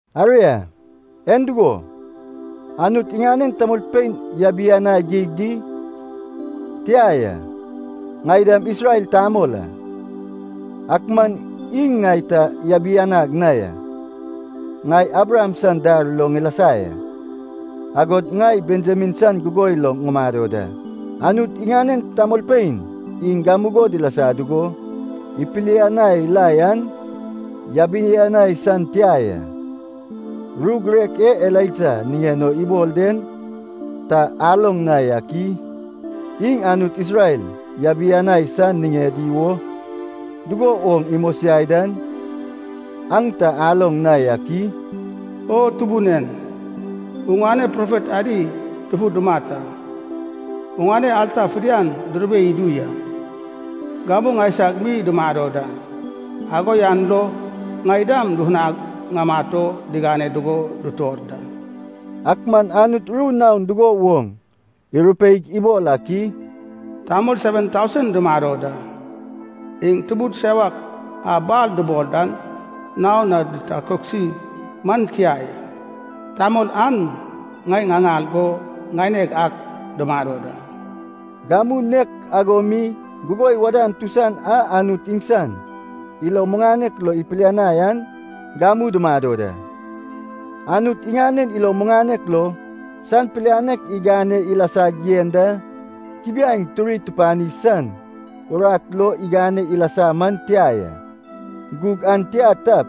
Aria, en dugo, Anut iŋanen tamolpein yabianai geig di? Tia ya. Ŋai dam Isrel tamol a, ak man iŋ ŋai ta yabianag na ya. Ŋai Abraham san dar lo ŋilasa ya, agod ŋai Benjamin san gugoi lo ŋumado da. Anut iŋanen tamolpein iŋ gamugo dilasa dugo ipilianai la yan yabianai san tia ya. Ru girek e Elaija niŋen o ibol den ta aloŋ na yak i? Iŋ Anut Isrel yabianai san niŋedi wo dugo woŋ imosiai dan aŋ ta aloŋ na yak i? “O Tubun en, oŋane profet adi dufu dumat a, oŋane alta fidian durube idu ya. Gamu ŋaiseg mi ŋumado da, ago yan lo ŋai dam dufunag ŋamat o digane dugo dutor da.” Ak man Anut ru naon dugo woŋ irupeig ibol ak i? “Tamol seven tausen dumado da, iŋ tubud sewak a Baal dubol dan naon na ditakoksi man tia ya. Tamol an ŋai ŋaŋal go ŋaineg ak dumado da.” Gamu nek ago mi gugoi wadan tusan a Anut iŋsan ilo muŋanek lo ipilianai an gamu dumado da. Anut iŋanen ilo muŋanek lo san pilianek igane ilasag yen da, kubiaeŋ turi tupani san urat lo igane ilasa man tia ya. Gug an tia tap,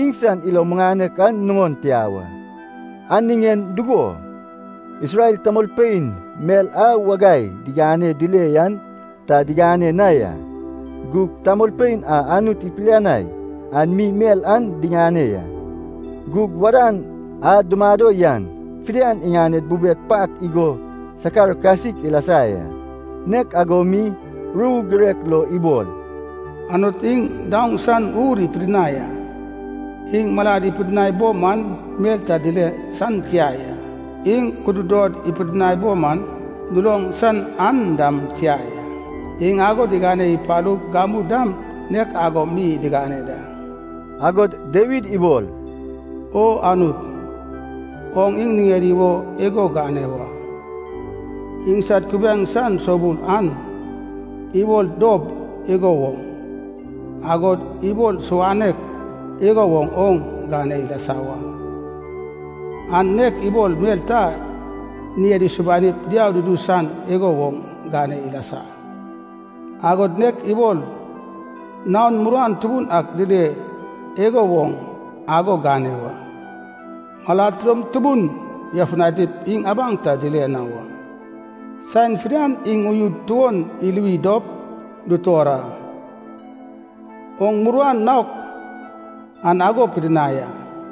iŋsan ilo muŋanek an nuŋon tia wa. An niŋen dugo? Isrel tamolpein mel a wagai diganeg dile yan ta diŋane na ya. Gug tamolpein a Anut ipilianai an mi mel an diŋane ya. Gug wadan a dumado yan fidian iŋaned bubed pat igo sakar kasik ilasa ya. Nek ago mi ru girek lo ibol, “Anut iŋ diŋaoŋ san ur ipidinai a. Iŋ malad ipidinai bo man mel ta dile san tia ya. Iŋ kududod ipidinai bo man duloŋ san an dam tia ya. Iŋ ago digane ipalug gamu dam nek ago mi digane da.” Agod Dawid ibol, “O Anut, oŋ iŋ niŋedi wo igo gane wa. Iŋsad kubiaeŋ san soubul an ibol dob igo woŋ, agod ibol suwanok igo woŋ oŋ gane ilasa wa. An nek ibol mel ta ŋied isubanip diau dudu san igo woŋ gane ilasa, agod nek ibol naon muruan tubun ak dile igo woŋ, ago gane wa. Malad tidom tubun yafutanip iŋ abaŋ ta dile na wa. Saen fidian iŋ uyud tuon iluwi dop dutor a. Oŋ muruan naok an ago pidinai a.”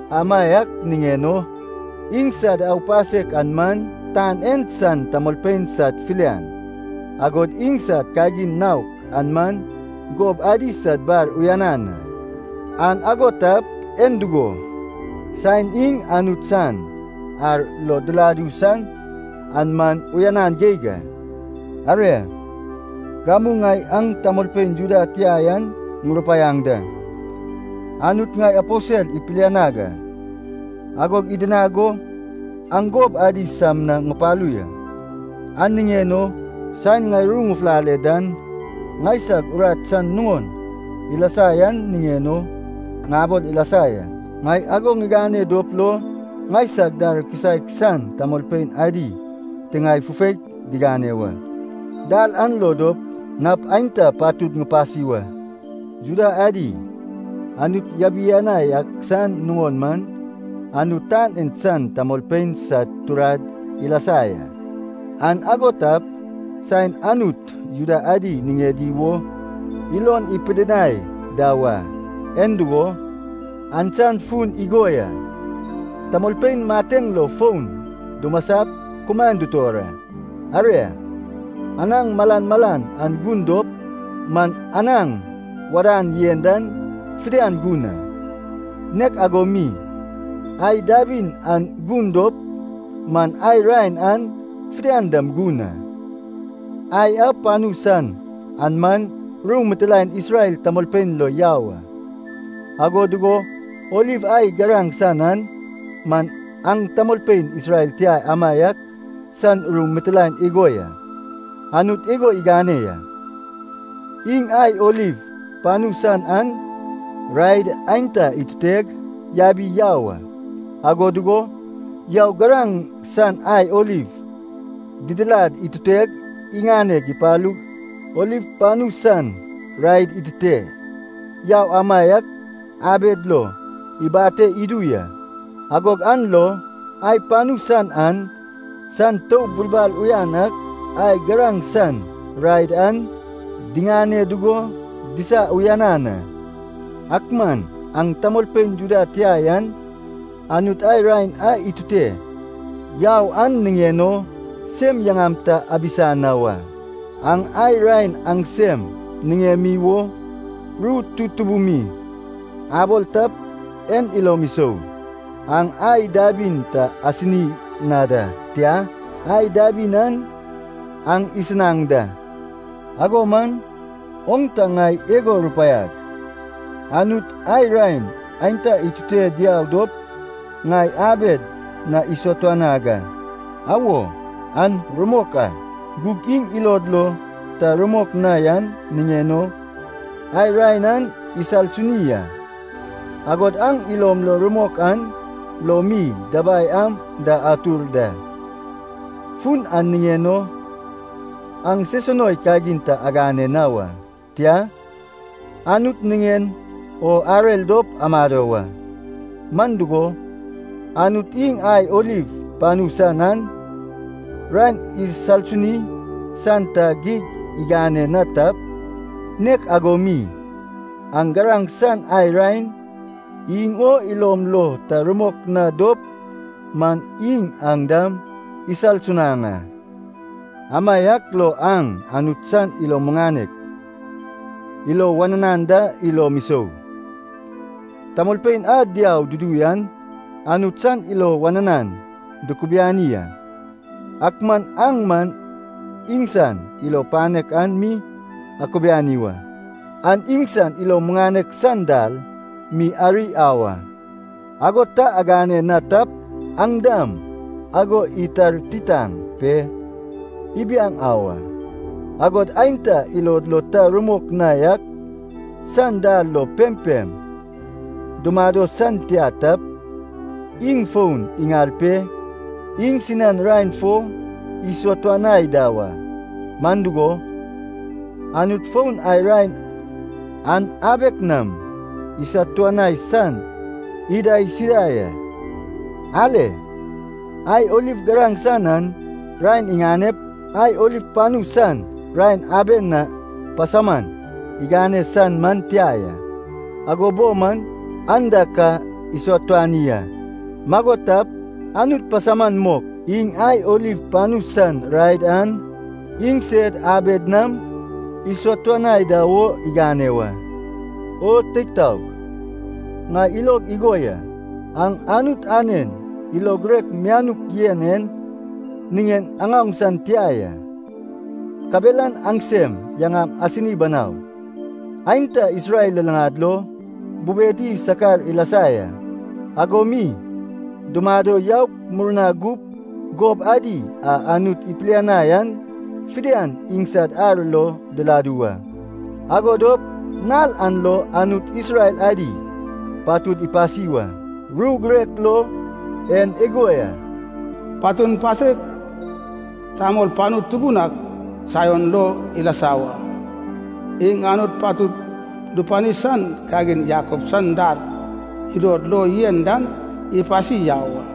Amaiak niŋen o, iŋsad aupasek an man tan en san tamolpein sad filian, agod iŋsad kagin naok an man gob adi sad bar uyanan a. An ago tap, en dugo, saen iŋ Anut san ar lo diladu san an man uyanan geig a. Aria, gamu ŋai aŋ tamolpein Juda tia yan ŋurupaiaŋ da. Anut ŋai aposel ipilianag a, agog idinag go aŋ gob adi sam na ŋupalu ya. An niŋen o saen ŋai ru ŋufulale dan, ŋaisag urat san nuŋon ilasa yan niŋen o ŋabol ilasa ya. Ŋai ago ŋigane dop lo ŋaisag dar kisaek san tamolpein adi tiŋae fufaik digane wa. Dal an lo dop nap aenta patud ŋupasi wa. Juda adi, Anut yabianai ak san nuŋon man Anut tan en san tamolpein sad turad ilasa ya. An ago tap, saen Anut Juda adi niŋedi wo ilon ipidinai da wa, en dugo? An san fun igo ya, tamolpein mateŋ lo fon dumasap kumaen dutor a. Aria, anaŋ malan malan an gun dop man anaŋ wadan yen dan fidian gun a. Nek ago mi, ai dabin an gun dop man, ai raen an fidian dam gun a. Ai a panu san an man ru mitilaen Isrel tamolpein lo yau a, ago dugo oliv ai garaŋ san an man aŋ tamolpein Isrel tia amaiak san ru mitilaen igo ya. Anut igo igane ya. Iŋ ai oliv panu san an raed aenta ituteg yabi yau a. Ago dugo yaug garaŋ san ai oliv didilad ituteg iŋane ipalug oliv panu san raed itute yau amaiak abed lo ibate idu ya. Agog an lo ai panu san an san toub bulbal uyan ak ai garaŋ san raed an diŋane dugo disa uyanan a. Ak man aŋ tamolpein Juda tia yan Anut ai raen a itute yau an niŋen o sem yaŋam ta abisa na wa. Aŋ ai raen aŋsem niŋemi wo ru tutubun mi abol tap en ilom isou. Aŋ ai dabin ta asini na da, tia, ai dabin an aŋ isinaŋ da. Ago man oŋ ta ŋai igo rupaiag, “Anut ai raen aenta itute diau dop ŋai abed na isatuanag a.” Awo, an rumok a. Gug iŋ ilod lo ta rumok na yan niŋen o ai raen an isalsuni a. Agod aŋ ilom lo rumok an lo mi dabai am da atur da. Fun an niŋen o aŋ sesunoi kagin ta agane na wa, tia, Anut niŋen o arer dop amado wa. Man dugo, Anut iŋ ai oliv panu san an raen isalsuni san ta geg igane na tap, nek ago mi aŋ garaŋ san ai raen iŋ o ilom lo ta rumok na dop man, iŋ aŋ dam isalsunaŋ a. Amaiak lo aŋ Anut san ilo muŋanek, ilo wananan da ilom isou. Tamolpein a diau dudu yan Anut san ilo wananan dukubiani a, ak man aŋ man iŋsan ilo panek an mi akubiani wa. Aŋ iŋsan ilo muŋanek san dal mi ari au a, ago ta agane na tap, aŋ dam ago itartitaŋ pe ibiaŋ au a. Agod aenta ilod lo ta rumok na yak san dal lo pempem dumado san tia tap, iŋ fon iŋal pe iŋsinan raen fo isatuanai da wa. Man dugo, Anut fon ai raen an abek nam isatuanai san idaisida ya. Ale. Ai oliv garaŋ san an raen iŋanep, ai oliv panu san raen aben na pasauman igane san man tia ya, ago bo man an da ka isatuani a. Mago tap, Anut pasauman mok iŋ ai oliv panu san raed an iŋsed abed nam isatuanai da wo igane wa. O teig taog, ŋai ilog igo ya, aŋ Anut anen ilo girek mianuk yen en niŋen aŋaoŋ san tia ya, kabelan aŋsem yaŋam asini banau. Aenta Isrel luluŋad lo bubedi sakar ilasa ya. Ago mi dumado yaup murna gup gob adi a Anut ipilianai an fidian iŋsan ar lo diladu wa. Ago dop nal an lo Anut Isrel adi fidian patud ipasi wa. Ru girek lo en igo ya, “Patun pasek tamol panu tubun ak Saion lo ilasa wa. Iŋ Anut patud dupani san kagin Jakob san dar ilod lo yen dan ipasi yau a.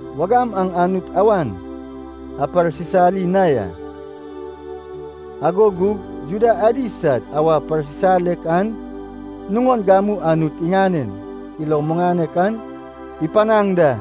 Wagam aŋ Anut awan aparsisali na ya, ago gug Juda adi sad awa parsisalek an nuŋon gamu Anut iŋanen ilo muŋanek aŋ ipanaŋ da.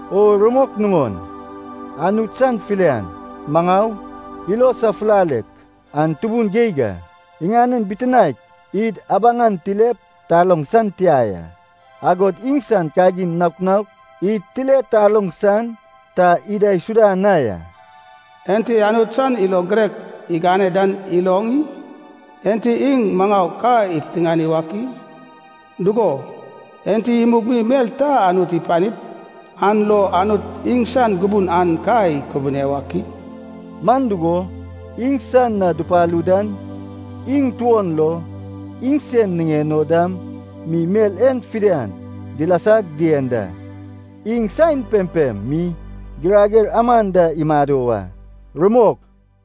O rumok nuŋon, Anut san filian, maŋau, ilo safulalek an tubun geig a. Iŋanen bitinaek id abaŋan tilep taloŋ san tia ya. Agod iŋsan kagin naok naok id tile taloŋ san ta idaisuda na ya. “Enti Anut san ilo girek igane dan iloŋ i? Enti iŋ maŋau ka ipiteŋani wak i?” “Dugo, enti imug mi mel ta Anut ipanip, an lo Anut iŋsan gubun an ka ikubune wak i?” Man dugo, iŋsan na dupalu dan, iŋ tuon lo, iŋsen niŋen o dam mi mel en fidian dilasag dien da. Iŋ saen pempem mi girager aman da imado wa. Rumok.